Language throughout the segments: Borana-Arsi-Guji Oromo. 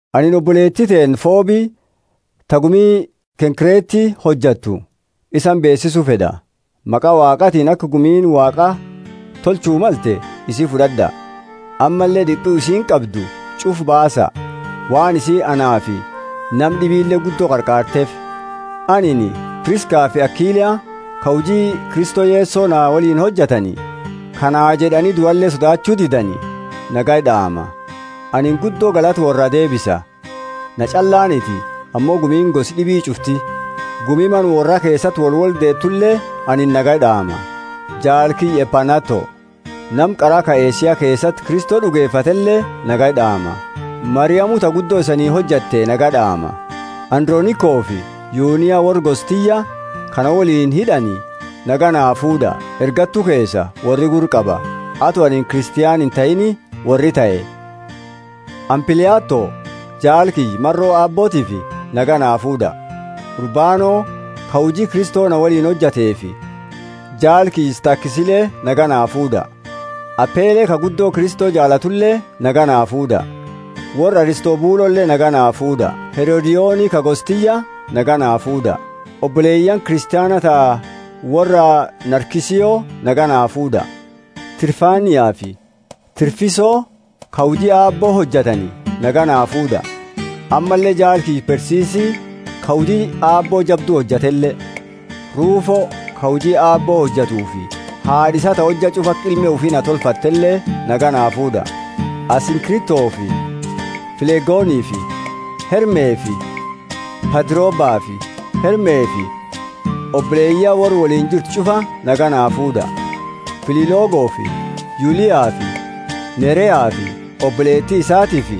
Anini oboleeti teenna Fobi, ta gumi Kenkreeti hojattu, isani beesisu fed'a. Maqa Waaqaatiini, aka gumiini Waaqa tolchu malte, isi fud'ad'a, ammalle d'ipu isiini qabdu ch'ufa baasa, waan isiini anaafi nama d'ibile guddo qarqaarteefi. Anini Priskafi Akila, ka huji Kristo Yeso na woliini hojatani, ka naa jed'ani duale sodaachu didani nagaya d'aama. Anini guddo galata worraa deebisa — na ch'allaaniti, ammo gumiini gosa d'ibi ch'ufti. Gumi mana worra keesati wolwoldeetule anini nagaya d'aama. Jaala kiyya Epaineto, nama qara ka Asia keesati Kristo d'ugefatele, nagaya d'aama. Mariamu, ta guddo isani hojatte, nagaya d'aama. Andronikofi Yunia, worra gosa tiyya, ka na woliini hid'ani, nagaya naa fuud'a; ergattu keesa worri gurra qaba, ato anini Kristiana intahiini worri tahe. Ampliato, jaala kiyya, maro Aabbootiifi, nagaya naa fuud'a. Urbano, ka huji Kristo na woliini hojateefi jaala kiyya Stakisile nagaya naa fuud'a. Apele ka guddo Kristo jaalatule nagaya naa fuud'a. Worra Aristobulole nagaya naa fuud'a. Herodioni, ka gosa tiyya, nagaya naa fuud'a; oboleyaani Kristiana ta worra Narkiso nagaya naa fuud'a. Trifainafi Trifosa, ka huji Aabbo hojatani, nagaya naa fuud'a, ammalle jaala kiyya Persisi ka huji Aabbo jabdu hojatele. Rufo, ka huji Aabbo hojatufi haad'a isaa ta hojja ch'ufa aka ilma ufi na tolfattele, nagaya naa fuud'a. Asinkritofi Flegonifi Hermefi Patrobafi Hermefi oboleyaani worra woliini jirtu ch'ufa nagaya naa fuud'a. Filologofi Yuliafi Nereafi oboleeti isaatiifi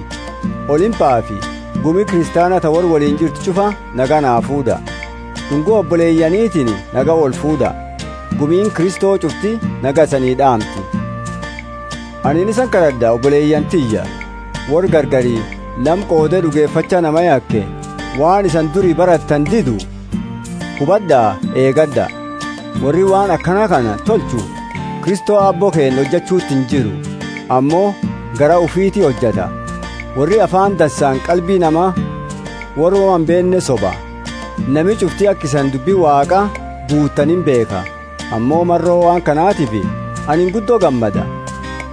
Olimpafi gumi Kristiana ta worra woliini jirtu ch'ufa nagaya naa fuud'a. D'ungo oboleyaanitini nagaya woli fuud'a. Gumiini Kristo ch'ufti nagaya isanii d'aamti. Anini isani kad'ad'a, oboleyaani tiyya: worra gargari nama qoode d'ugefacha nama yake waan isani duri barattani didu, hubad'a, eegad'a. Worri waan akana kana tolchu Kristo Aabbo keenna hojachuuti injiru, ammo garaa ufiti hojata. Worri Afaani dansaani qalbi nama woma imbeenne soba. Nami ch'ufti aka isani dubbi Waaqaa guuttani imbeekha, maro waan kanatifi anini guddo gammada.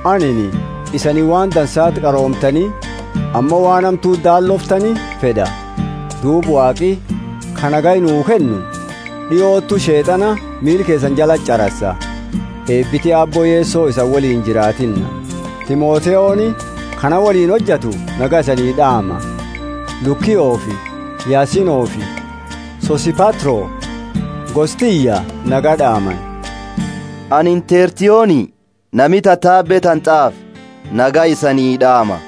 Anini isani waan dansati qaroomtani ammo waan hamtuti daallooftani fed'a. Duuba Waaqi, ka nagaya nuu kennu, d'iotu Sheet'ana miila keesani jalati ch'arasa. Eebiti Aabbo Yeso isani woliini jiraatinna. Timotheoni, ka na woliini hojatu, nagaya isanii d'aama; Lukiofi Yasonifi Sosipatro, gosa tiyya, nagaya d'aamani. Anini Tertioni, nami tatabe tana t'aafe, nagaya isani d'aama.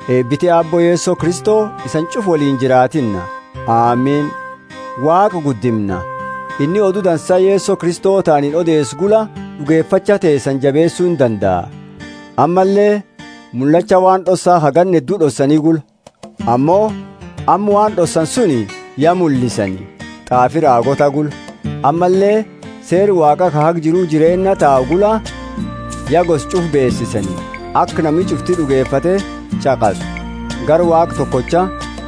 Eebiti Aabbo Yeso Kristo isani ch'ufa woliini jiraatinna. Amini.] Waaqa guddimna! Inni Odu Dansa Yeso Kristo ta anini odeesu gula d'ugefacha teesani jabeesu indandaa, ammalle mullacha waan d'ossa ka ganna heddu d'ossani gula. Ammo amma waan d'ossani suni ya mullisani t'aafi raagoota gula; ammalle seera Waaqa ka haga jiru jireenna tau gula ya gosa ch'ufa beesisani, aka nami ch'ufti d'ugefate ch'aqasu. Gara Waaqa tokocha,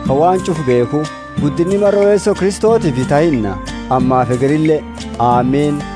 ka waan ch'ufa beekhu, guddindindinni maro Yeso Kristotiifi tahinna, ammafi hegerile! Amini.